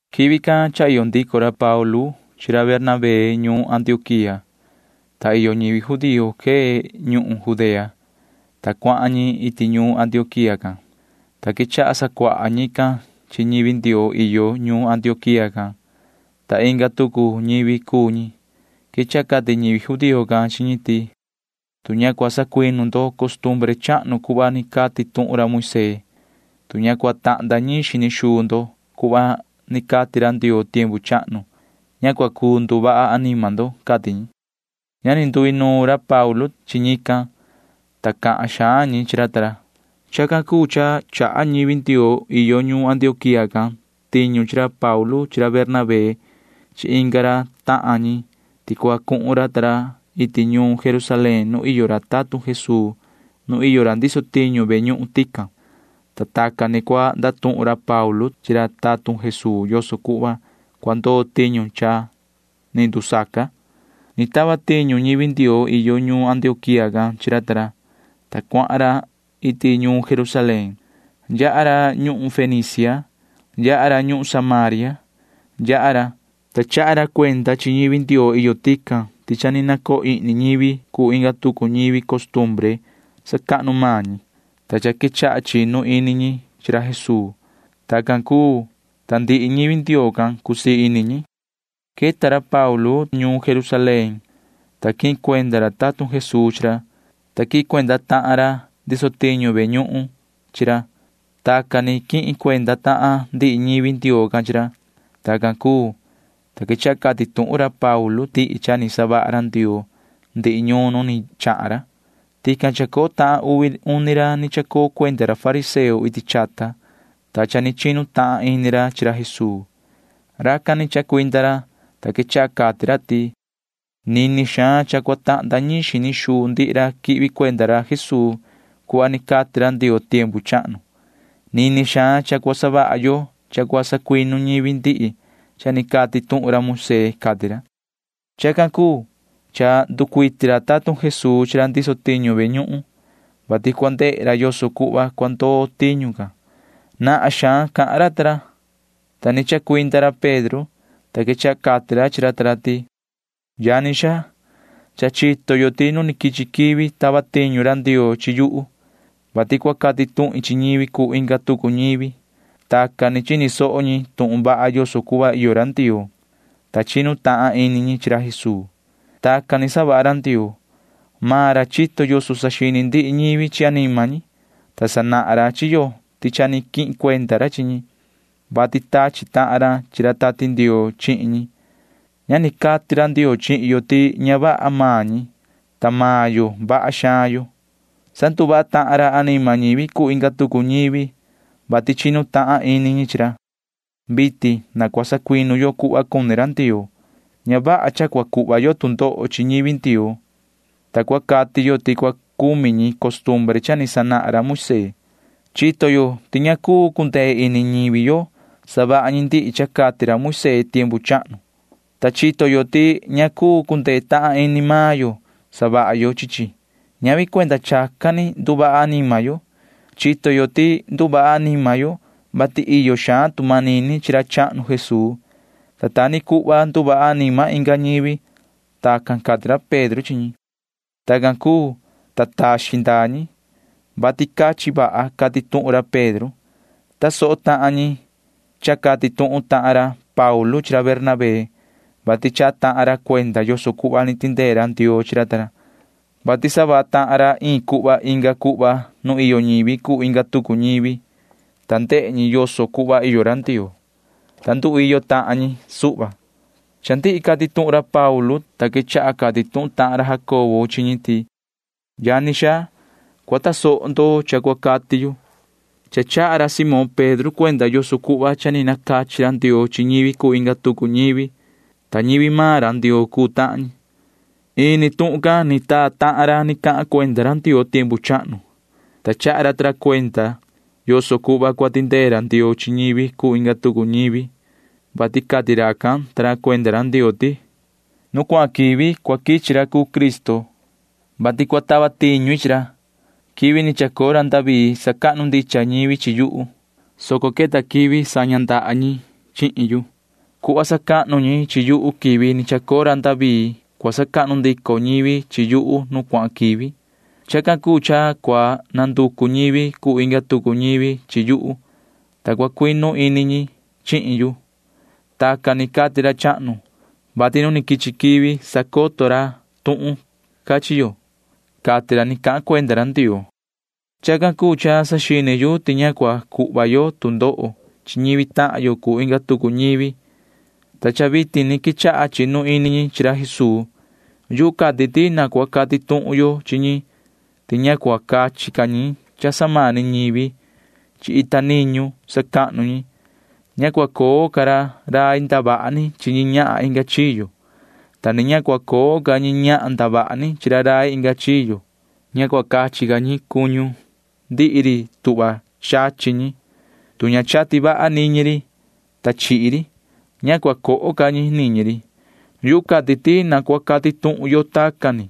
Quivi can cha iyo ndico ra Paulu chi ra Bernabé ñuun Antioquía, ta iyo ñivi judío quee ñuhun Judea, ta cuahan ñi iti ñuun Antioquía can, ta quechaha sacuaha ñican chi ñivi Ndioo iyo ñuun Antioquía can, ta inga tucu ñivi cuu ñi. Quechaha cati ñivi judío can chi ñi ti: ―Tu ña cua sacuinu ndo costumbre chahnu cuhva ni cati tuhun ra Moisee, tu ña cua tahnda ñiin xini xuu ndo cuhva ni cati ra Ndioo tiempu chahnu, ña cua cuu nduvaha anima ndo ―cati ñi. Ña ni nduinuun ra Paulu ta ra chi ñican, ta cahan xaan ñi chi ra ta ra. Chacan cuu cha chaha ñivi Ndioo iyo ñuun Antioquía can tiñu chi ra Paulu chi ra Bernabé chi inga ra tahan ñi ti cua cuhun ra ta ra iti ñuun Jerusalén nu iyo ra tatun Jesuu nu iyo ra ndiso tiñu ve ñuhun tican, ta tacan ni cua ndatuhun ra Paulu ta ra chi ra tatun Jesuu yoso cuhva cua ndoo tiñu cha ni ndusaca. Ni tava tiñu ñivi Ndioo iyo ñuun Antioquía can chi ra ta ra, ta cuahan ra iti ñuun Jerusalén. Yaha ra ñuhun Fenicia. Yaha ra ñuhun Samaria. Yaha ra, ta chaha ra cuenda chi ñivi Ndioo iyo tican ti cha ni nacoo ihni ñivi cuu inga tucu ñivi costumbre sacahnu maan ñi, ta cha quechaha chinu ini ñi chi ra Jesuu. Tacan cuu, ta ndihi ñivi Ndioo can―cusii ini ñi. Queta ra Paulu ta ra ñuun Jerusalén, ta quihin cuenda ra tatun Jesuu chi ra, ta quihin cuenda tahan ra ndiso tiñu ve ñuhun chi ra. Tacan ni quihin cuenda tahan ndihi ñivi Ndioo can chi ra. Tacan cuu, ta quechaha cati tuhun ra Paulu ta ra ndihi cha ni savaha ra Ndioo ndihi ñuun nu ni chahan ra. Tican iyo tahan uvi uni ra ni chacoo cuenda ra fariseo iti chata, ta cha ni chinu tahan ini ra chi ra Jesuu. Racan ni chacuinda ra, ta quechaha cati ra ti: ―Nini xaan cha cua tahnda ñiin xini xuu ndihi ra quihvi cuenda ra Jesuu cuhva ni cati ra Ndioo tiempu chahnu. Nini xaan cha cua savaha yo cha cua sacuinu ñivi ndihi cha ni cati tuhun ra Moisee ―cati ra. Chacan cuu cha nducuiti ra tatun Jesuu chi ra ndiso tiñu ve ñuhun, vati cua ndehe ra yoso cuhva cua ndoo tiñu can. Nahan xaan cahan ra ta ra, ta ni chacuinda ra Pedro, ta quechaha cati ra chi ra ta ra ti: ―Yani xaa, cha chito yo ti nu quichi quivi tava tiñu ra Ndioo chi yuhu, vati cua cati tuhin chi ñivi cuu inga tucu ñivi. Tacan ni chini soho ñi tuhun vaha yoso cuhva iyo ra Ndioo, ta chinu tahan ini ñi chi ra Jesuu. Tacan ni savaha ra Ndioo. Maan ra chito yoso saxini ndihi ñivi chi anima ñi, ta sanahan ra chi yo ti cha ni quihin cuenda ra chi ñi, vati tachi tahan ra chi ra Tati Ndioo chihin ñi. Ña ni cati ra Ndioo chihin yo ti ña vaha maan ñi, ta maan yo vaha xaan yo. Sanduvaha tahan ra anima ñivi cuu inga tucu ñivi, vati chinu tahan ini ñi chi ra. Vitin na cua sacuinu yo cuhva cuni ra Ndioo. Ña vaha cha cua cuhva yo tu ndoho chi ñivi Ndioo, ta cua cati yo ti cua cumi ñi costumbre cha ni sanahan ra Moisee. Chito yo ti ña cuu cundee ini ñivi yo savaha ñi ndihi cha cati ra Moisee tiempu chahnu, ta chito yo ti ña cuu cundee tahan ini maan yo savaha yo chi chi. Ñavi cuenda chacan ni nduvaha anima yo. Chito yo ti nduvaha anima yo, vati iyo xaan tu manini chi ra chahnu Jesuu, ta ta ni cuhva nduvaha anima inga ñivi. Tacan cati ra Pedro chi ñi. Tacan cuu, ta taxin ndaa ñi, vati cachin vaha cati tuhun ra Pedro. Tasoho tahan ñi cha cati tuhun tahan ra Paulu chi ra Bernabé, vati chaha tahan ra cuenda yoso cuhva ni tindee ra Ndioo chi ra ta ra, vati savaha tahan ra iin cuhva inga cuhva nu iyo ñivi cuu inga tucu ñivi, ta ndehe ñi yoso cuhva iyo ra Ndioo, ta nduiyo tahan ñi suhva. Cha ndihi cati tuhun ra Paulu ta ra, ta quechaha cati tuhun tahan ra Jacobo chi ñi ti: ―Yani xaa, cua tasoho ndo cha cua cati yu. Cha chaha ra Simón Pedro cuenda yoso cuhva cha ni nacachi ra Ndioo chi ñivi cuu inga tucu ñivi, ta ñivi maan ra Ndioo cuu tahan ñi. Ini tuhun can ni taa tahan ra ni cahan cuenda ra Ndioo tiempu chahnu, ta chaha ra ta ra cuenda yoso cuhva cua tindee ra Ndioo chi ñivi cuu inga tucu ñivi, vati cati racan ta ra cuenda ra Ndioo ti: Nu cuahan quivi cua quichi ra cuu Cristo, vati cua tava tiñu i chi ra. Quivi ni chacoo ra David sacahnu ndicha ñivi chi yuhu, soco queta quivi saña ndaha ñi chihin yu. Cuhva sacahnu ñi chi yuhu quivi ni chacoo ra David cua sacahnu ndico ñivi chi yuhu nu cuahan quivi. Chacan cuu cha cua nanducu ñivi cuu inga tucu ñivi chi yuhu, ta cua cuinu ini ñi chihin yu. Tacan ni cati ra chahnu, vati nu ni quichi quivi sacoto ra tuhun can chi yo, cati ra ni cahan cuenda ra Ndioo. ’Chacan cuu cha saxini yu ti ña cua cuhva ca yo tu ndoho chi ñivi tahan yo cuu inga tucu ñivi, ta cha vitin ni quechaha chinu ini ñi chi ra Jesuu. Yuhu cati ti na cua cati tuhun yo chi ñi ti ña cua cachi ca ñi cha samani ñivi chi ita niñu sacahnu ñi. Ña cua coo ca ra rai ndavaha ni chi ñi ñahan inga chiyo, ta ni ña cua coo ca ñi ñahan ndavaha ni chi ra rai inga chiyo. Ña cua cachi ca ñi cuñu ndihi ri tuhva chachi ñi, tu ña chati vaha niñi ri, ta chihi ri. Ña cua coho ca ñi niñi ri. Yuhu cati ti na cua cati tuhun yo tacan ni,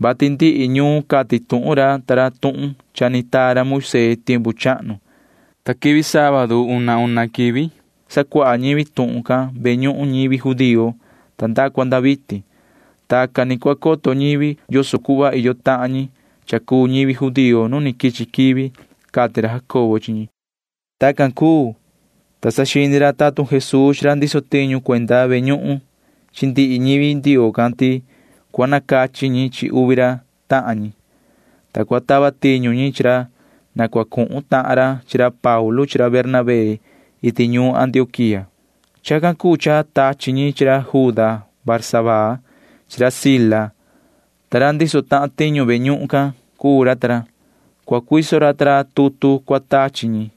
vati ndihi ñuun cati tuhun ra ta ra tuhun cha ni taa ra Moisee tiempu chahnu, ta quivi sábadu una una quivi sacuaha ñivi tuhun can ve ñuhun ñivi judío nda cua nda vitin. Tacan ni cua coto ñivi yoso cuhva iyo tahan ñi cha cuu ñivi judío nu ni quichi quivi ―cati ra Jacobo chi ñi. Tacan cuu, ta saxini ra tatun Jesuu chi ra ndiso tiñu cuenda ve ñuhun chi ndihi ñivi Ndioo can ti cua nacachi ñi chi uvi ra tahan ñi, ta cua tava tiñu ñi chi ra na cua cuhun tahan ra chi ra Paulu chi ra Bernabé iti ñuun Antioquía. Chacan cuu cha tachi ñi chi ra Juda Barsabaa chi ra Sila, ta ra ndiso tahan tiñu ve ñuhun can cuu ra ta ra. Cua cuiso ra ta ra tutu cua tachi ñi,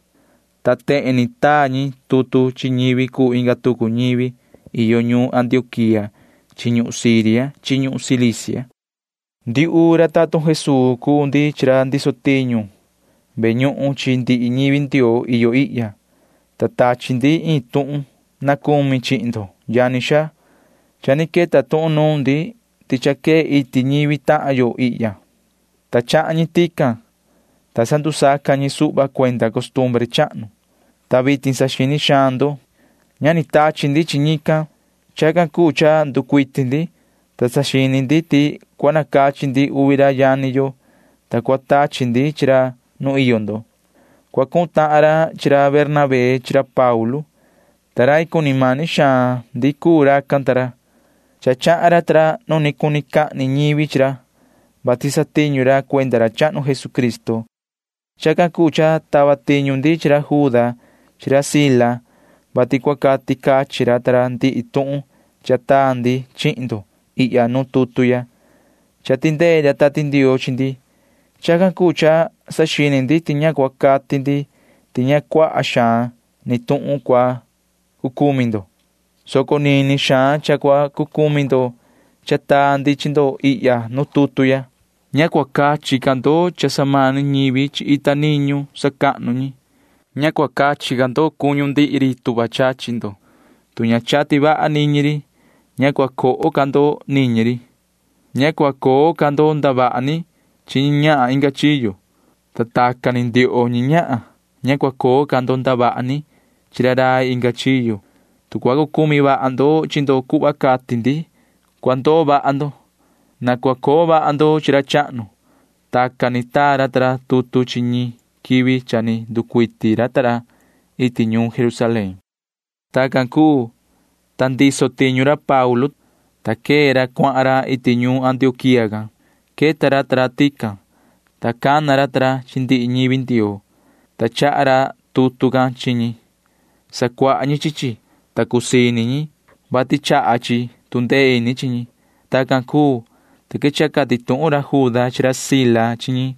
ta tehen ni taa ñi tutu chi ñivi cuu inga tucu ñivi iyo ñuun Antioquía chi ñuhun Siria chi ñuhun Cilicia: “Ndiuhu ra tatun Jesuu cuu ndi chi ra ndiso tiñu ve ñuhun chi ndihi ñivi Ndioo iyo ihya, ta tachi ndi iin tuhun na cumi chihin ndo, yani xaa. Cha ni queta tuhun nuun ndi ti cha quee iti ñivi tahan yo ihya, ta chahan ñi tican, ta sandusaca ñi suhva cuenda costumbre chahnu, ta vitin saxini xaan ndo. Ña ni tachi ndi chi ñican. Chacan cuu cha nducuiti ndi, ta saxini ndi ti cua nacachi ndi uvi ra yani yo, ta cua tachi ndi chi ra nu iyo ndo. Cua cuhun tahan ra chi ra Bernabé chi ra Paulu, ta rai cuni mani xaan ndi cuu racan ta ra. Cha chahan ra ta ra nu ni cuni cahni ñivi chi ra, vati satiñu ra cuenda ra chahnu Jesucristo. Chacan cuu cha tava tiñu ndi chi ra Juda chi ra Sila, vati cua cati cachin ra ta ra ndihi tuhun cha taa ndi chihin ndo ihya nu tutu ya. Cha tindee ra Tati Ndioo chi ndi. Chacan cuu cha saxini ndi ti cua cati ndi ti ña cuaha xaan ni tuhun cua cucumi ndo, soco nini xaan cha cua cucumi ndo cha taa ndi chi ndo ihya nu tutu ya. Ña cua cachi ca ndo cha samani ñivi chi ita niñu sacahnu ñi. Ña cua cachi ca ndo cuñu ndihi ri tuhva chachi ndo, tu ña chati vaha niñi ri. Ña cua coho ca ndo niñi ri. Ña cua coo ca ndo ndavaha ni chi ñi ñahan inga chiyo, ta tacan ni ndioho ñi ñahan, ña cua coo ca ndo ndavaha ni chi ra rai inga chiyo. Tu cua cucumi vaha ndo chi ndo cuhva cati ndi, cua ndoo vaha ndo. Na cua coo vaha ndo chi ra chahnu.” Tacan ni taa ra ta ra tutu chi ñi quivi cha ni nducuiti ra ta ra iti ñuun Jerusalén. Tacan cuu, ta ndiso tiñu ra Paulu ta ra, ta quee ra cuahan ra iti ñuun Antioquía can. Queta ra ta ra tican, ta cana ra ta ra chi ndihi ñivi Ndioo, ta chaha ra tutu can chi ñi. Sacuaha ñi chi chi, ta cusii ini ñi, vati chaha chi tu ndee ini chi ñi. Tacan cuu, ta quechaha cati tuhun ra Juda chi ra Sila chi ñi,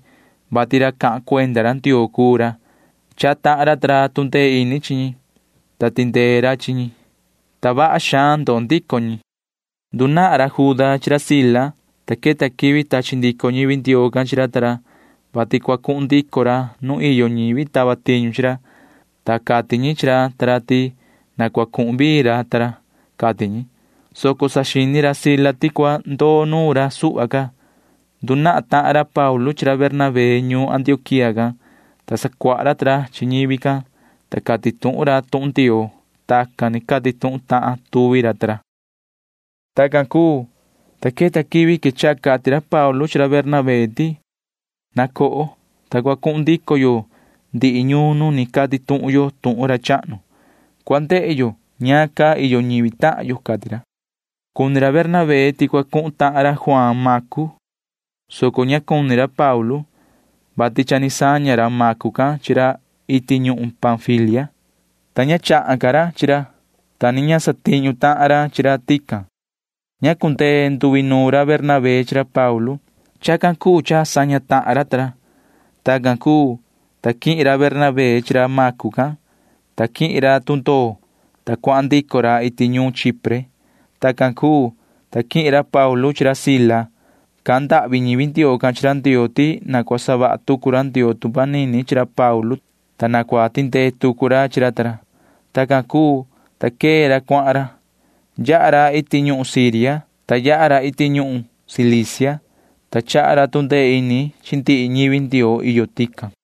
vati ra cahan cuenda ra Ndioo cuu ra. Chaha tahan ra ta ra tu ndee ini chi ñi, ta tindee ra chi ñi, ta vaha xaan ndoo ndico ñi. Ndunahan ra Juda chi ra Sila, ta queta quivi tachi ndico ñivi Ndioo can chi ra ta ra, vati cua cuhun ndico ra nu iyo ñivi tava tiñu chi ra, ta cati ñi chi ra ta ra ti na cua cuhun vii ra ta ra, cati ñi, soco saxini ra Sila ti cua ndoo nuun ra suhva ca. Ndunahan tahan ra Paulu chi ra Bernabé ñuun Antioquía can, ta sacuaha ra ta ra chi ñivi can, ta cati tuhun ra tuhun Ndioo. Tacan ni cati tuhun tahan tuvi ra ta ra. Tacan cuu, ta queta quivi quechaha cati ra Paulu chi ra Bernabé ti: ―Na coho, ta cua cuhun ndico yo ndihi ñuun nu ni cati tuhun yo tuhun ra chahnu. Cua ndehe yo ñaan caa iyo ñivi tahan yo ―cati ra. Cuni ra Bernabé ti cua cuhun tahan ra Juaan Macu, soco ña cuni ra Paulu, vati cha ni saña ra Macu can chi ra iti ñuhun Panfilia, ta ña chahan ca ra chi ra, ta ni ña satiñu tahan ra chi ra tican. Ña cundee nduinuun ra Bernabé chi ra Paulu. Chacan cuu cha saña tahan ra ta ra. Tacan cuu, ta quihin ra Bernabé chi ra Macu can, ta quihin ra ta ra tundoo, ta cuahan ndico ra iti ñuhun Chipre. Tacan cuu, ta quihin ra Paulu chi ra Sila. Cahan ndahvi ñivi Ndioo can chi ra Ndioo ti na cua savaha tucu ra Ndioo tu manini chi ra Paulu ta ra, ta na cua tindee tucu ra chi ra ta ra. Tacan cuu, ta quee ra cuahan ra. Yaha ra iti ñuhun Siria, ta yaha ra iti ñuhun Cilicia, ta chaha ra tu ndee ini chi ndihi ñivi Ndioo iyo tican.